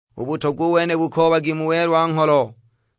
U butogwa u wene bukoobagi mu welwa-ngholo,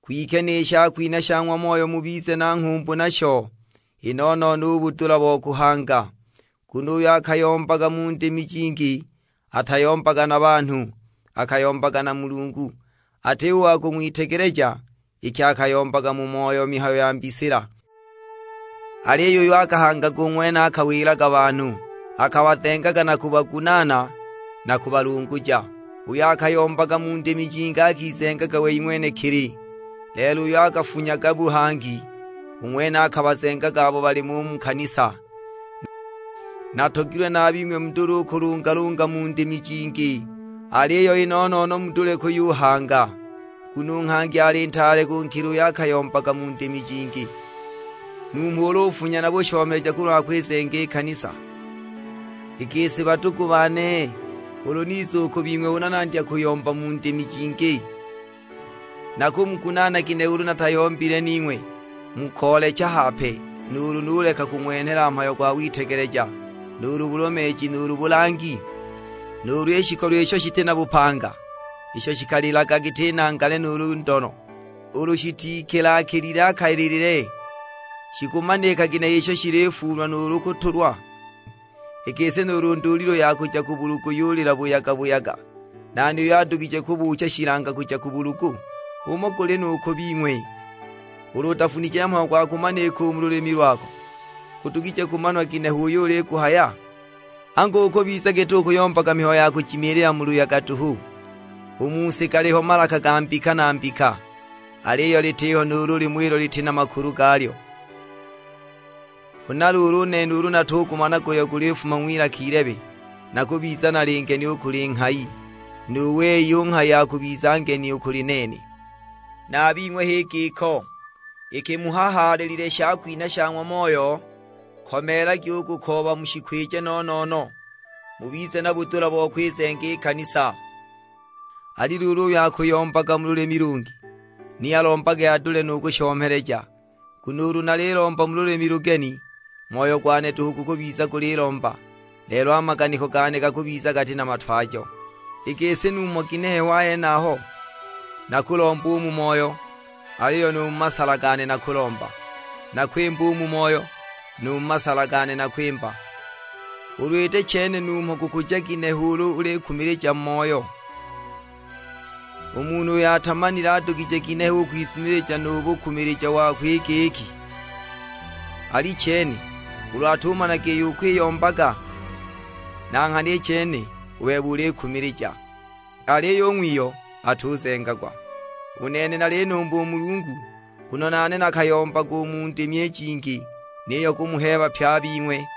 kwike ni shakwinha sha ng'wa Moyo mubize na nghumbu nasho; i no-no-no u budula bo kuhanga. Nguno uyo akayombaga mu ndimi jingi atayombaga na banhu, akayombaga na Mulungu. Atiho u wa kung'witegeleja, iki akayombaga mu moyo mihayo ya mbisila. Aliyo uyo akahangaga u ng'wene akawilaga banhu, akabazengaga na kubagunaana na kubalunguja. Uyo akayombaga mu ndimi jingi akizengaga wei ng'wenekili, lelo uyo akafunyaga buhangi, u ng'wene akabazengaga abo balimo u mu kanisa. Natogilwe na a bing'we mudule u kulungalunga mu ndimi jingi, aliyo i no-no-no mudule kuyuhanga. Nguno u nghangi ali ntaale kunkila uyo akayombaga mu ndimi jingi, numho ulu ufunya na bushomeleja kulwa kwizenga i kanisa. I gisi badugu bane, ulu niza u ku bing'we huna nandya kuyomba mu ndimi jingi, nakumugunaana ginehe ulu natayombile ning'we mu koolecha hape, nuulu nuleka kung'wenhela mhayo gwa witegeleja nuulu bulomeeji, nuulu bulangi? Nuulu i shikolo isho shiti na bupanga isho shikalilaga giti nangale nuulu ndono, ulu shitikila-kilile a kalilile, shikumanika ginehe isho shilifuulwa nuulu kutulwa? I gisi nuulu ndulilu ya kuja ku bulugu yulila buyaga-buyaga, nani uyo adugije kubuucha shilanga kuja ku bulugu? H'umo guli nu ku bing'we, ulu utafunije mhayo gwa kumanika u mu lulimi lwako, gudugije kumanwa ginehe uyo uliguhaya? Angu ukubiza giti ukuyombaga mihayo ya kujimilila mu luyaga duhu! U mu si galiho malaka ga mbika na mbika, aliyo litiho nuulu limo ilo liti na makulu galyo. Huna luulu u nene ulu natugumanaga uyo gulifuma ng'wilaka ilebe, nakubiza nali ngeni u kuli nghayi, nu wei u nghayi akubiza ngeni u kuli nene. Na a bing'we h'i giko; iki muhahaalilile shakwinha sha ng'wa Moyo, komeelagi u kukooba mushikwije no-no-no; mubize na budula bo kwizenga i kanisa. Ali luulu uyo akuyombaga mu lulimi lungi, ni alombage adule nu kushomeleja. Nguno ulu nalilomba mu lulimi lugeni, moyo gwane duhu gukubiza gulilomba, lelo a maganiko gane gakubiza gati na matwajo. I gisi numho ginehe ho a henaho? Nakulomba u mu moyo, aliyo nu mu masala gane nakulomba; nakwimba u mu moyo, nu mu masala gane nakwimba. Ulu iti chene numho gukuja ginehe ulu ulikumilija mu moyo? U munhu uyo atamanile adugije ginehe u kwizunilija nu bukumilija wako i giki, "Alichene," ulu atumanaga iyo ukwiyombaga? Na nghana i chene u bebe ulikumilija, aliyo u ng'wiyo atuzengagwa! U nene nalinumba u Mulungu, nguno nane nakayombaga u mu ndimi i jingi, niyo kumuheeba pye a bing'we.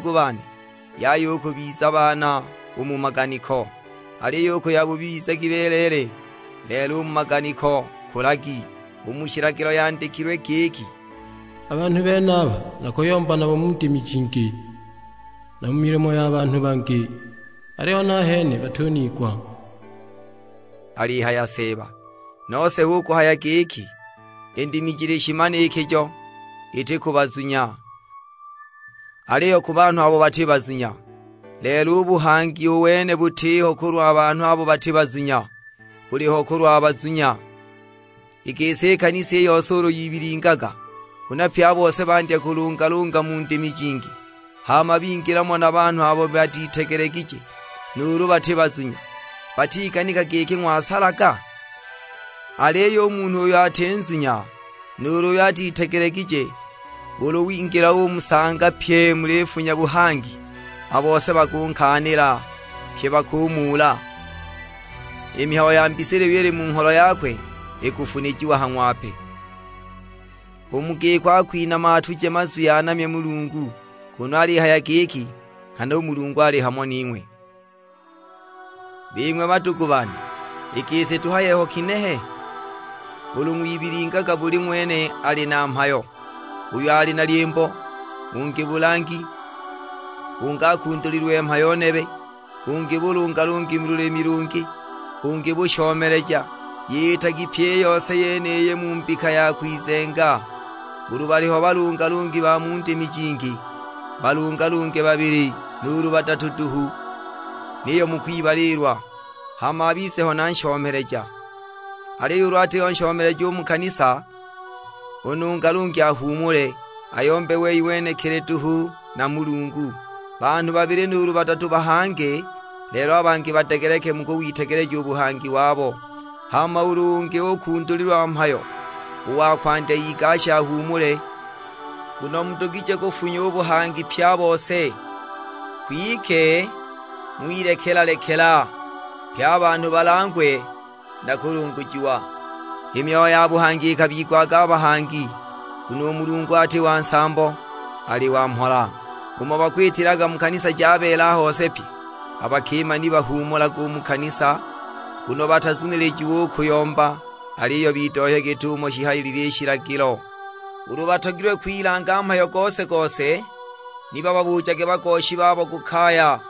Badugu bane, yaya u kubiza baana u mu maganiko, aliyo u ku yabubi bizagi beleele; lelo u mu maganiko kulagi. U mu shilagilo yandikilwe giki, "A banhu benaba nakuyomba nabo mu ndimi jingi, na mu milomo ya banhu bangi, aliyo nahene batuniigwa;" alihaya Seeba! Nose hu kuhaya giki, i ndimi jili shimanikijo, iti ku bazunya, aliyo ku banhu abo bati bazunya; lelo u buhangi u wene butiho kulwa banhu abo bati bazunya, buliho kulwa bazunya. I gisi i kanisa i yose ulu yibilingaga, huna pye a bose bandya kulungalunga mu ndimi jingi, hama bingila mo na banhu abo batitegelegije nuulu bati bazunya, batiganika giki ng'wasalaga? Aliyo u munhu uyo ati nzunya, nuulu uyo atitegelegije, ulu wingila umusanga pyi mulifunya buhangi, a bose bakunkaanila; pye bakunamula. I mihayo ya mbisila iyo ili mu ngholo yakwe ikufunijiwa ha ng'wape; u mu giko akwinama atuje mazwi anamye Mulungu, kunu alihaya giki, "Nghana u Mulungu ali hamo ning'we!" Bing'we badugu bane, i gisi tuhaye ho kinehe? Ulu ng'wibilingaga buli ng'wene ali na mhayo; uyu ali na lyimbo, ungi bulangi, ungi akundulililwe mhayo nebe, ungi bulungalungi mu lulimi lungi, ungi bushomeleja! Yitagi pyi i yose yeniyi mu mbika ya kwizenga. Ulu baliho balungalungi ba mu ndimi jingi, balungalunge babili nuulu badatu duhu, niyo mu kwibaliilwa, hama abize ho na nshomeleja. Aliyo ulu atiho nshomeleja u mu kanisa, u nungalungi ahuumule, ayombe wei ng'wenekili duhu na Mulungu. Banhu babili nuulu badatu bahange, lelo a bangi badegeleke mu kuwitegeleja u buhangi wabo. Hama ulu ungi ukundulilwa mhayo, u wa kwandya igashe ahuumule. Nguno mudugije kufunya u buhangi pye a bose, kwike ng'wilekela-lekela, pye a banhu balangwe na kulungujiwa. I myoyo ya buhangi ikabigwaga a bahangi; nguno u Mulungu ati wa nsambo, ali wa mhola. Umo bakwitilaga mu kanisa ja beela hose pye, a bakima ni bahuumulage u mu kanisa; nguno batazunilijiwe u kuyomba, aliyo bidohye git'umo shihayilile i shilagilo. Ulu batogilwe kwilanga mhayo gose-gose, ni bababujage bagoshi babo ku kaya,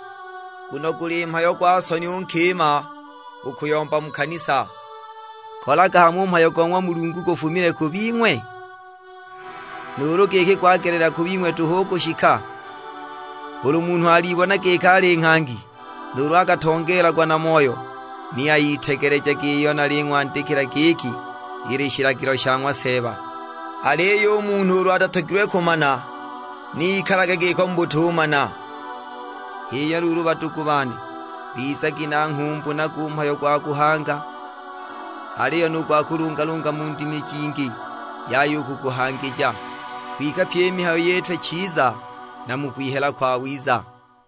nguno guli mhayo gwa soni u nkima u kuyomba mu kanisa. Kolaga hamo u mhayo go ng'wa Mulungu gufumile ku bing'we? Nuulu giki gwagelela ku bing'we duhu u kushika? Ulu munhu alibona giki ali nghangi nuulu akatongeelagwa na Moyo, ni ayitegelejage iyo naling'wandikila giki ili shilagilo sha ng'wa Seeba. Aliyo u munhu ulu atatogilwe kumana, ni ikalage giko mu butumana. H'iyo luulu badugu bane, bizagi na nghumbu nago u mhayo gwa kuhanga, aliyo nu gwa kulungalunga mu ndimi jingi yaya u kuguhangija. Kwike pyi i mihayo yitwe chiza na mu kwihela kwawiza.